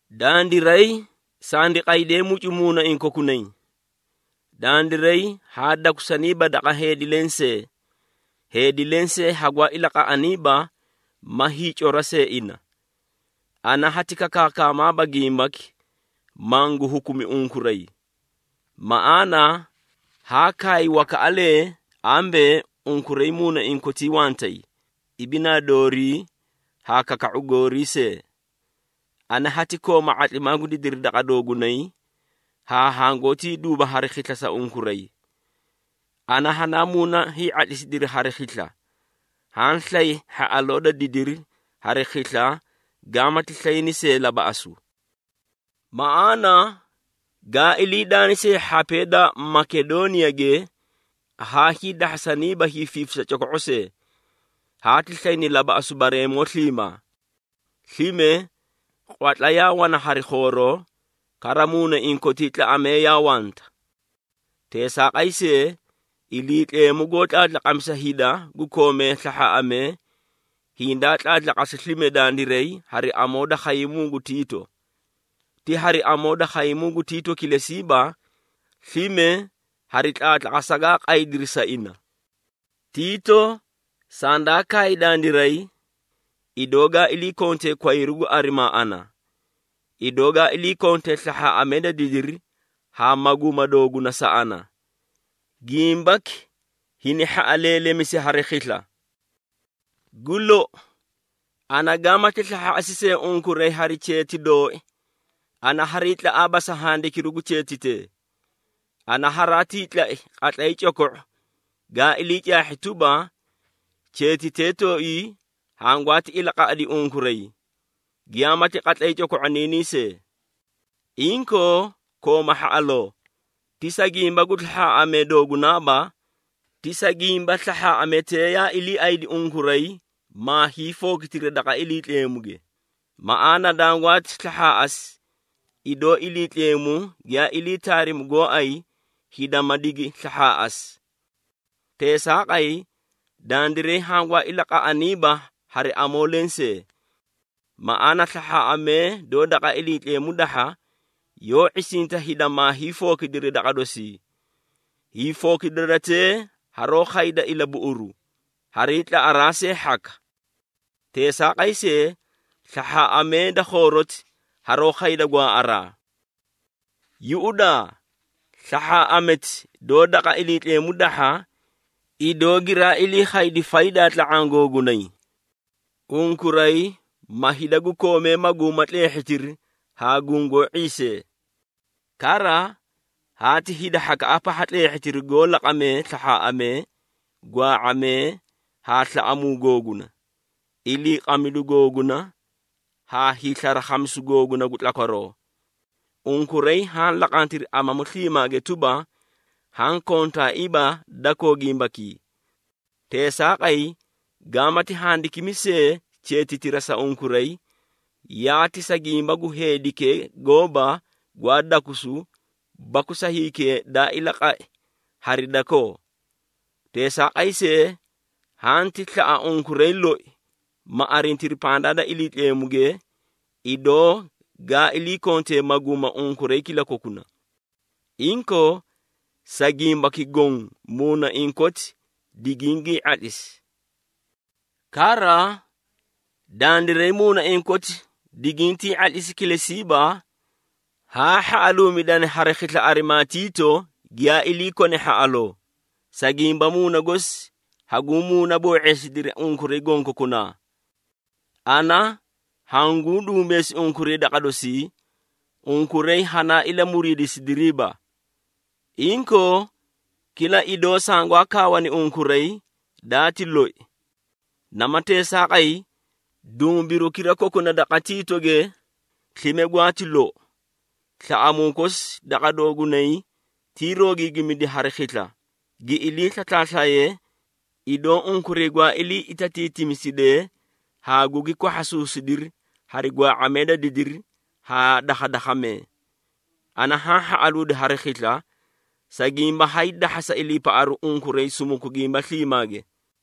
Dandiray sandi qaydee mucu muunaiĩ kokunay. Dandiray haa dakusaniiba daqa heedi lensee, heedi lensee hangwaa ilaqaꞌaniiba ma hiicora see ina. Ana hati kakaakamaaba gimbaki, mangu hukumi unkuray. Maꞌaana haa kaay wakaꞌalee ambee, unkuray muunaiĩ kotii wantay, ibinaa doorii haa kaka⁄u goorii see. Ana hati kooma ⁄atlimaa gu didiri daqa doogunay haa hangootii duuba hari khisla sa unkuray. Ana hanaa muuna hii⁄atlisidiri hari khisla, haã slay hhaꞌaloo da didiri hari khisla gaamati slayne see labaꞌasu. Maꞌaana gaa ilii daani see hhapee da Makedooniyage, haa hiidahhasaniiba hiifiifisa coko⁄o see. Haati slayni labaꞌasu bareemoo sliimaa. Slime, qwatla yaa wana hari khooroo, kara muunaiĩ kotii tlaꞌamee yaa wanta. Teesaaqay see, Iliitleemu goó tlaatlaqamisa hida gu koomee slahhaaꞌamee, hindaa tlaatlaqasi slime dandiray hari amoo da khaymuu gu Tiito. Ti hari amoo da khaymuu gu Tiito kilesiiba, slime hari tlaatlaqasa gaa qaydiri sa ina. Tiito sandaa kaay dandiray, idoo gaa ilii kontee kwayru gu arimaa ana, idoo ga ilii kontee slahhaaꞌamee da didiri haa maguuma dooguna sa ana. Gimbaki hini hhaꞌaleelemisi hari khisla. Gu lou, ana gaamati slahhaaꞌasi see unkuray hari cheeti dooi, ana hariitlaꞌaaba sa handikiru gu cheetitee. Ana haraatii tlai qatlay coko⁄u gaa ilii caahhi tuba, cheetitee tooii hangwaati ilaqaꞌadi unkuray, giyaamati qatlay coko⁄oniinii see. Inkoo, kooma hhaꞌaloo, ti sa gimba gu slahhaaꞌamee doogunaaba, ti sa gimba slahhaaꞌametee yaa iliiaydi unkuray maa hiifookitiri daqa Iliitleemuge. Maꞌaana dangwaati slahhaaꞌasi, idoo Iliitleemu giyaa ilii taarimi gooay hida ma digi slahhaaꞌasi. Teesaaqay, dandiray hangwaa ilaqaꞌaniiba hari amoo lensee. Maꞌaana, slahhaaꞌamee doó daqa Iliitleemu dahha, yoó ⁄isinta hida maa hiifookidiri daqa dosi. Hiifookidaratee haroó khayda ilabuꞌuru, hariitlaꞌaraa see hhaka. Teesaaqay see, slahhaaꞌamee da khooroti haroó khayda gwaaꞌaraa. Yuꞌudaa, slahhaaꞌameti doó daqa Iliitleemu dahha, idoo giraa ilii khaydi faydaa tla⁄aã googunay. Unkuray, ma hida gu koomee maguuma tleehhitiri haa gungoó ⁄iisee. Kara, haati hida hhakaꞌa pahha tleehhitiri goó laqamee slahhaaꞌamee, gwaa⁄amee, haa slaꞌamuu googuna, iliiqamidu googuna haa hiislarakhamisu googuna gu tlakwaroo. Unkuray haã laqantiri amamu sliimaage tuba, haã kontaaiiba dakoo gimbakii. Teesaaqay, gaamati handikimi see cheetitira sa unkuray, yaati sa gimba gu heedikee gooba gwaa dakusu baku sa hikee daa ilaqai hari dakoo. Teesaaqay see, hanti slaꞌa unkuray loi ma arintiri pandaa da Iliitleemuge, idoo gaa ilii kontee maguuma unkuray kilakokuna. Inkoo, sa gimbaki goõ muunaiĩ koti digingiĩ ⁄atlisi. Kara, dandiray muunaiĩ koti digintii ⁄atlisi kilesiiba, haa hhaꞌaluumidani hari khisla arimaa Tiito giyaa ilii kone hhaꞌaloo, sa gimba muuna gosi hanguũ muuna boo⁄iisidiri unkuray gonkokunaa. Ana hanguũ dumbeesi unkuray daqa dosii, unkuray hanaa ilamuriidisidiriiba. Inkoo, kila idoo sangwaa kaawani unkuray, daati loi. Nama teesaaqay, dumbirukira kokuna daqa Tiitoge slime gwaati lou. Slaꞌamuu kosi daqa doogunay tiiroogiigimidi hari khisla, gi ilii slaslaaslaye, idoo unkuray gwaa ilii itatiitisimidee haa gugi kwahhasuusidiri hari gwaa⁄amee da didiri haa dakhadakhamee. Ana haã hhaꞌaluudi hari khisla, sa gimba haydahhasa iliipaꞌaru unkuray sumuku gimba sliimaage.